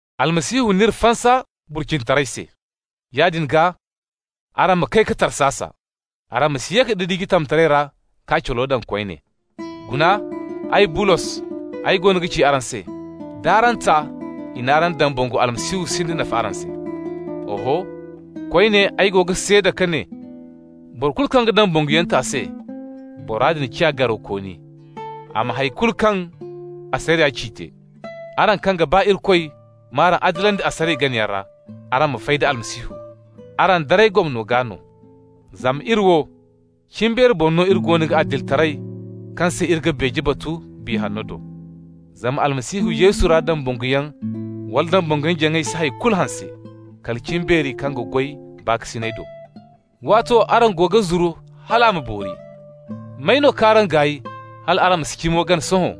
Almasihu n'iri fansa burcinitaray se. Yaadin gaa araŋ ma kay ka tarsasa. Araŋ ma si ye ka didiji tamtaray ra, k'a calo daŋ koyne. Guna ay, Bulos, ay goono ga ci araŋ se: d'araŋ ta i n'araŋ dambangu, Almasihu sinda nafa araŋ se. Oho, koyne ay go ga seeda ka ne boro kulu kaŋ ga dambanguyaŋ ta se: bora din ciya garawkooni a ma hay kulu kaŋ asariya ci te. Araŋ kaŋ ga ba Irikoy m'araŋ adilandi asariya ganayaŋ ra, araŋ fay da Almasihu, araŋ daray gomno gaa no. Zama iri wo, cimbeeri boŋ no iri goono ga adilitaray kaŋ se iri ga beeje batu Biya Hanno do. Zama Almasihu Yesu ra dambanguyaŋ wala dambanguyaŋ-jaŋay si hay kulu hanse, kala cimbeeri kaŋ ga goy baakasinay do. Waato araŋ goono ga zuru hal a ma boori. May no k'araŋ gaay hal araŋ ma si cimo gana sohõ?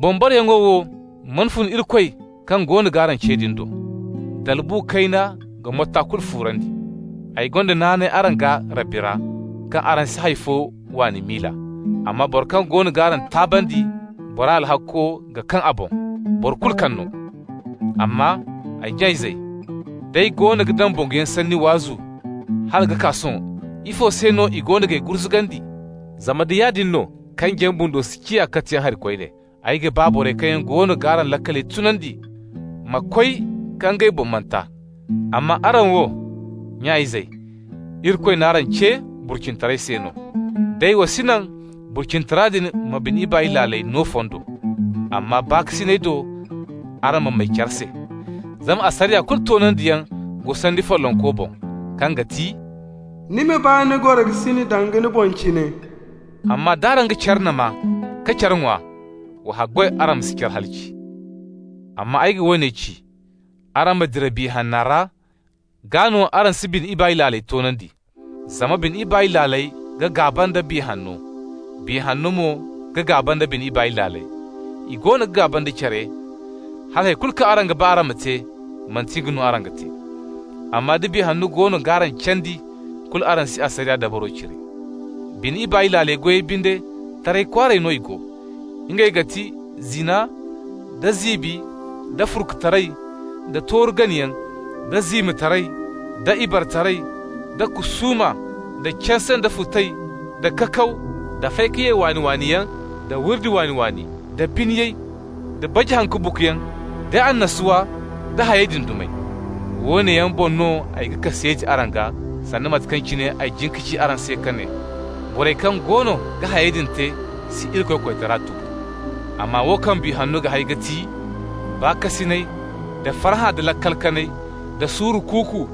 Boŋ-bareyaŋo wo mana fun Irikoy kaŋ goono g'araŋ ce din do! Dalbu kayna ga motta kulu fuurandi. Ay gonda naanay araŋ gaa Rabbi ra kaŋ araŋ si hay fo waani miila. Amma boro kaŋ goono g'araŋ taabandi, bora alhakko ga kaŋ a boŋ, boro kulu kaŋ no. Amma, ay nya-izey, d'ay goono ga dambanguyaŋ sanni waazu hala ka kaa sohõ, ifo se no i goono g'ay gurzugandi? Zama nda yaadin no, kanjiyaŋ bundo si ciya katiyaŋ hari koyne. Ay ga ba borey kaŋ yaŋ goono g'araŋ laakal tunandi ma koy ka ngey boŋ manta. Amma araŋ wo, nya-izey, Irikoy n'araŋ ce burcinitaray se no. Day wa si naŋ burcinitara din ma bine ibaay laaley no fondo, amma baakasinay do araŋ ma may care se. Zama asariya kulu toonandiyaŋ go sanni follonko boŋ, kaŋ ga ti: «Ni ma ba ni gorokasin danga ni boŋ cine.» Amma d'araŋ ga care nama ka care ŋwa, wa haggoy araŋ ma si care halaci. Amma ay ga woone ci: araŋ ma dira Biya Hanna ra, gaa no araŋ si bine ibaay laaley toonandi. Zama bine ibaay laaley ga gaaba nda Biya Hanno. Biya Hanno mo ga gaaba da bine ibaay laaley. I goono ga gaaba nda care, hala hay kulu kaŋ araŋ ga ba araŋ ma te, manti nga no araŋ ga te. Amma da Biya Hanno goono g'araŋ candi, kulu araŋ si asariya dabaro cire. Bine ibaay laaley goyey binde, taray kwaaray no i go. Ngey ga ti: zina, da ziibi, da furkutaray, da tooru ganayaŋ, da ziimataray, da ibaretaray, da kusuuma, da canse, da futay, da kakaw, da fay-ka-ye-waani-waaniyaŋ, da wurdi waani-waani, da biniyay, da baji haŋ-ka-buguyaŋ, da annasuwa, da hayey din dumey. Woone yaŋ boŋ no ay ga kaseeti araŋ gaa, sanda mate kaŋ cine ay jin ka ci araŋ se ka ne: borey kaŋ goono ga hayey din te si Irikoy koytara tubu. Amma wo kaŋ Biya Hanno ga hay ga ti: baakasinay, da farhã, da laakal kanay, da suuru kuuku,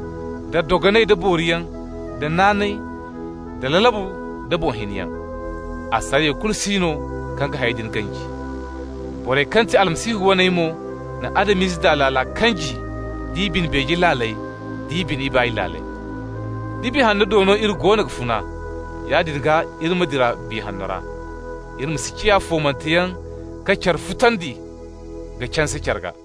da dogonay, da booriyaŋ, da naanay, da lalabu, da boŋ hiniyaŋ. Asariya kulu si no kaŋ ga hayey din ganji. Borey kaŋ ga ti Almasihu waney mo na Adam-ize daa laaley kanji, d'i bine beeje laaley, d'i bine ibaay laaley. Da Biya Hanno do no iri goono ga funa, yaadin gaa iri ma dira Biya Hanno ra. Iri ma si ciya foomanteyaŋ, ka care futandi, ka canse care gaa.